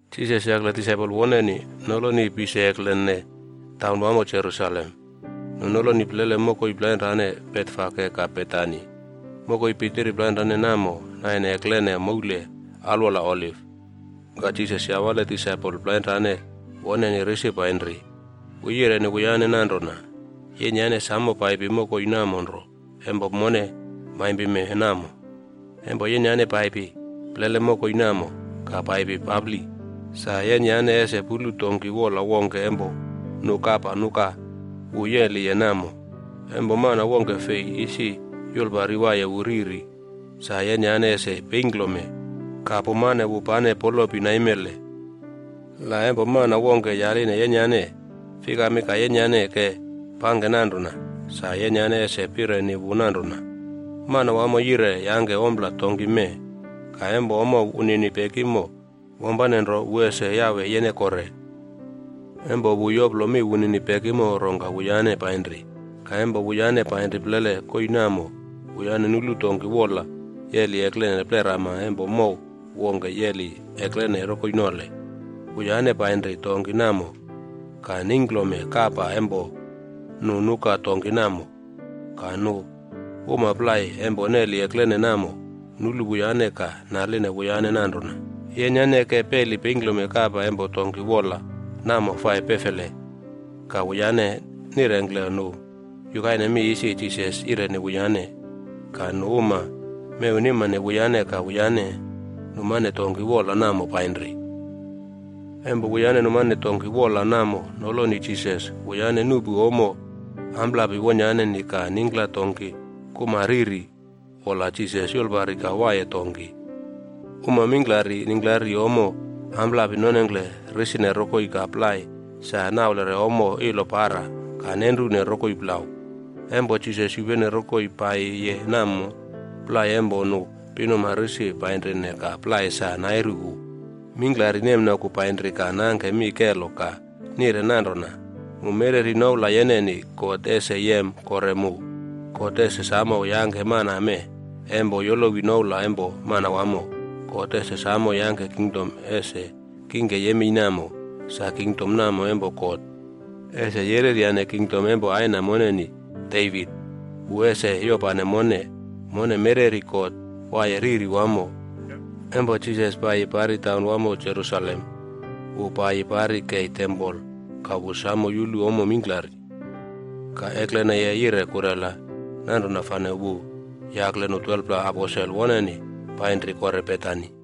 Jisas yakle disaipol woneni noloni pise eklenene taunwamo Jerusalem. Nu noloni plele mokoi plainrane Betfage ka Betani. Mokoi pitiri plainrane namo naine eklene moule alwola Oliv. Ka Jisas yawale disaipol plainrane woneni risi painri. Wu yireni wuyane nanrona, “Yenyane samo paipi mokoi namo nro empo mone maimpime namo. Empo yenyane paipi plele mokoi namo ka paipi papli, sa yenyane ese pulu donki woꞌla wongke empo nu kapa nuka wu yeliye namo, empo mana wongke fei isi yulpari waiye wu riri. Sa yenyane ese peingklome kapa ka pumane wu pane polopi naimele. La empo mana wongke yaline yenyane, ‘Fikami ka yenyane ke pangke nanrona,’ sa yenyane ese pireni wu nanrona, ‘Manawamo yire yangke ompla donki mee. Ka empo ommo wunini pekimo, wampane nro wu ese yawe yene kore.’” Empo wu yoplo mi wunini pekimo rongka wuyane painri. Ka empo wuyane painri plele koii namo, wuyane nulu donki woꞌla yeli eklene plerama empo mow wongke yeli eklene rokoi nole. Wuyane painri donki namo ka neingklome kapa empo nu nuka donki namo. Ka nu uma plai empo neli eklene namo nulu wuyane ka naline wuyane nanrona, “Yenyane ke peli peingklome kapa empo donki woꞌla namo fai pefele?” Ka wuyane nirengkle nu yukaine mi isi Jisas yireni wuyane. Ka nu uma mewnimane wuyane ka wuyane numane donki woꞌla namo painri. Empo wuyane numane donki woꞌla namo noloni Jisas, wuyane nuꞌpu ommo ampapli wonyaneni ka ningkla donki kuma riri wola Jisas yulpari ka waiye donki. Uma mingklari ningklari ommo ampapli nonengkle risine rokoi ka plai sa naulere ommo ilo para ka nenrune rokoi plau. Empo Jisas yupene rokoi paiyiye namo, plai empo nu pinuma risi painrine ka plai sa nairu wu. Mingklari nemnoku painri ka nangke mi kelo ka nire nanrona, “Mu mereri noula yeneni, God ese yem kore mu! God ese samo yangke mana mee empo yolowi noula empo Manawamo. God ese samo yangke kingdom ese kingke yemei namo. Sa Kingdom namo empo God, ese yereryane kingdom empo aina moneni, Devit. Wu ese yopane mone. Mone mereri God waiye riri wamo!” Empo Jisas paiyi pari taunwamo Jerusalem, wu paiyi pari kei tempol ka wu samo yulu ommo mingklari. Ka ekleneye yire kurela, nanrona fane wu yakle nu 12pla aposel woneni painri kore Betani.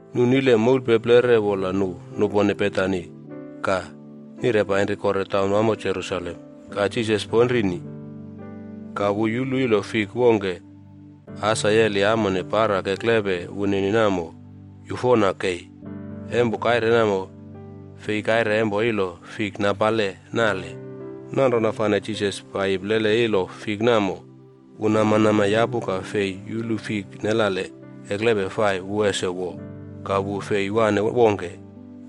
Nu nile moulpeplere wola nu nupone Betani ka nire painri kore taunwamo Jerusalem, ka Jisas ponrini. Ka wu yulu ilo fik wongke asa yeli amone para keklepe wunini namo yufona kei. Empo kaire namo, fei kaire empo ilo fik napale nale. Nanrona fane Jisas paiyi plele ilo fik namo, wu namanama yapu ka fei yulu fik nelale keklepe fai wu ese wo. Ka wu fei wane wongke,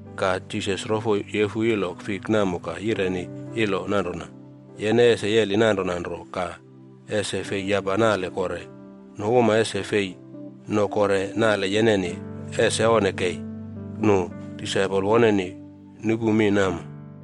Ka Jisas rofo yefu ilo fik namo ka yireni ilo nanrona, “Yene ese yeli nanrona nro ka ese fei yapa nale kore. Nu uma ese fei no kore nale yeneni. Ese onne kei!” Nu disaipol woneni nupu mi namo.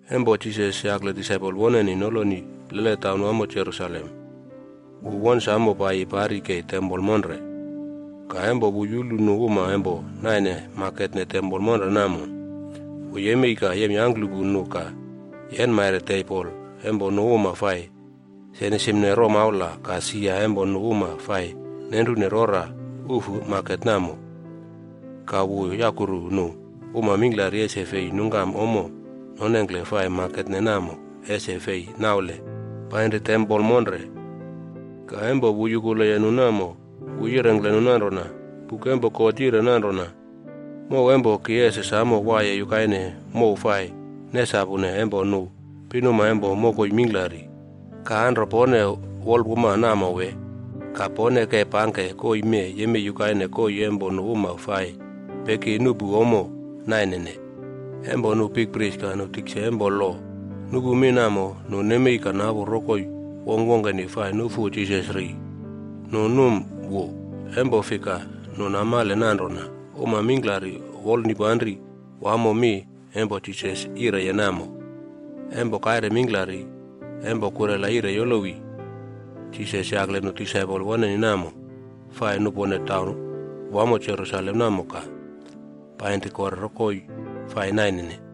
Empo Jisas yakle disaipol woneni noloni plele taunwamo Jerusalem, wu won samo paiyi pari kei tempol monre. Ka empo wu yulu nu uma empo naine maketne tempol monre namo, wu yemei ka yemyangklupu nu ka yenmaire tebol empo nu uma fai senisimne romaula ka sia empo nu uma fai nenrune rora ufu maket namo. Ka wu yakuru nu uma mingklari ese fei nungkam ommo nonengkle fai maketne namo ese fei naule panri tempol monre. Ka empo wu yukuleye nu namo, wu yirengkle nu nanrona, “Buk empo God yire nanrona, ‘Mow empo ki ese samo waiye yukaine mow fai nesapune empo nu pinuma empo mokoi mingklari.’ Ka anro pone wolpuma namo wee? Ka pone ke pangke koii mee yemei yukaine koii empo nu uma fai peki nuꞌpu ommo nainene.” Empo nu bikpris ka nu tikse empo lo nuꞌpu mi namo, nu nemei ka napu rokoi wongkwongkeni fai nufu Jisas ri. Nu num wu, empo fika, nu namale nanrona uma mingklari wolnipanri wamo mi empo Jisas yireye namo. Empo kaire mingklari, empo kurela yire yolowi, Jisas yakle nu disaipol woneni namo, fai nupone taunwamo Jerusalem namo ka painri kore koii fai nainene.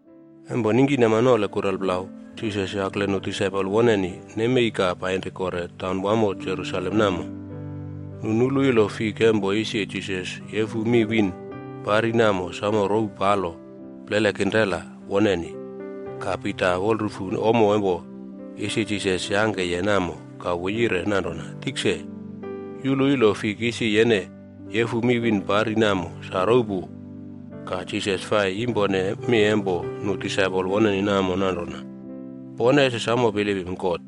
Empo ningkinama nole kurelplau Jisas yakle nu disaipol woneni nemei ka painri kore taunwamo Jerusalem namo, nu nulu ilo fik empo isi Jisas yefu mi wiin pari namo samo rouw palo plele kinrela woneni. Ka Pita wolrufu ommo empo isi Jisas yangkeye namo ka wu yire nanrona, “Tikse, yulu ilo fik isi yene yefu mi wiin pari namo sa rouw pu.” Ka Jisas fai yimpone mi empo nu disaipol woneni namo nanrona, “Pone ese samo bilipim God.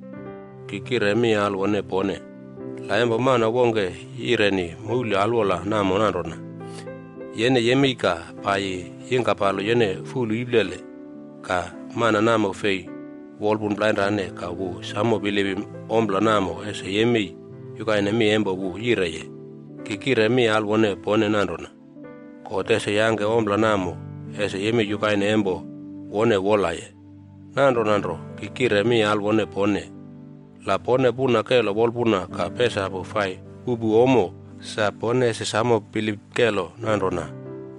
Ki kire mi alwone pone, la empo mana wongke yireni moule alwola namo nanrona, ‘Yene yemei ka paiyi yingkapalo yene fulu iplele.’ Ka mana namo fei wolpun plainrane ka wu samo bilipim ompla namo ese yemei yukaine mi empo wu yireye. Ki kire mi alwone pone nanrona, God ese yangke ompla namo ese yemei yukaine empo wone wolaye. Nanrona nro, ki kire mi alwone pone, la pone puna kelo wolpuna ka pesapu fai puꞌpu ommo sa, pone ese samo bilip kelo nanrona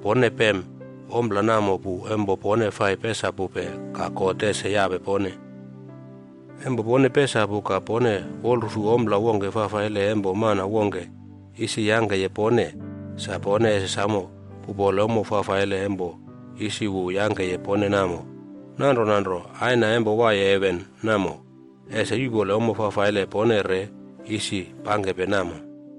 pone pem ompla namo pu empo pone fai pesapupe ka God ese yape pone.” “Empo pone pesapu ka pone wolrufu ompla wongke fafaile empo mana wongke isi yangkeye pone, sa pone ese samo puꞌpole ommo fafaile empo isi wu yangkeye pone namo. Nanrona nro Aina empo waiye heven namo, ese yuꞌpole ommo fafaile pone re isi pangkepe namo.”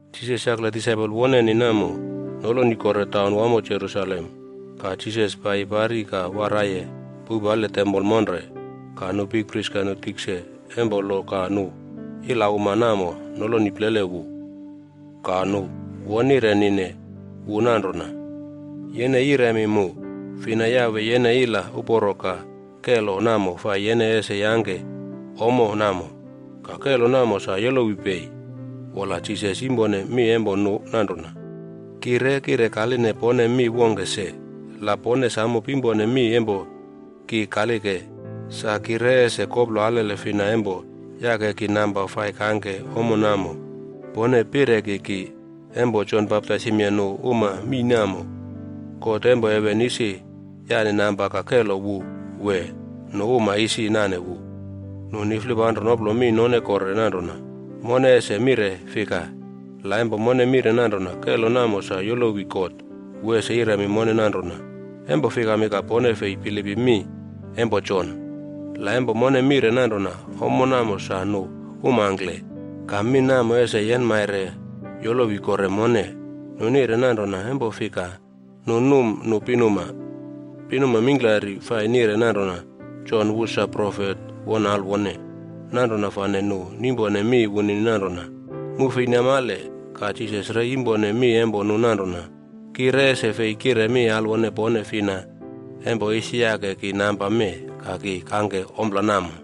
Jisas yakle disaipol woneni namo noloni kore taun wamo Jerusalem. Ka Jisas paiyi pari ka waraiye poupale tempol monre. Ka nu bikpris ka nu tikse empo lo ka nu ila uma namo noloni plele wu. Ka nu won nirenine wu nanrona, “Yene yiremi mu, fina yawe yene ila uporo ka kelo namo fai yene ese yangke ommo namo? Ka kelo namo sa yolowi pei?” Wola, Jisas yimpone mi empo nu nanrona, “Ki re kire kaline pone mi wongke se. La pone samo pimpone mi empo ki kalike, sa ki re ese koplo alele fina empo yake ki namba fai kangke ommo namo. Pone pireki ki, empo Jon baptaisimye nu uma mii namo, God empo heven isi yane namba ka kelo wu wee nu uma isi nane wu?” Nu niflipanro noplo mi none kore nanrona, “Mone ese mire fika? La empo mone mire nanrona kelo namo sa yolowi God, wu ese yiremi mone nanrona, ‘Empo fikami ka pone fei bilipim mi empo Jon?’ La empo mone mire nanrona ‘Ommo namo sa nu umangkle,’ ka mi namo ese yenmaire yolowi kore mone.” Nu nire nanrona empo fika, nu num nu pinuma. Pinuma mingklari fai nire nanrona Jon wu sa profet won alwone. Nanrona fane nu nimpone mi wunini nanrona, “Mu fei namale.” Ka Jisas re yimpone mi empo nu nanrona, “Ki re ese fei kire mi alwone pone fina empo isi yake ki namba mee ka ki kangke ompla namo.”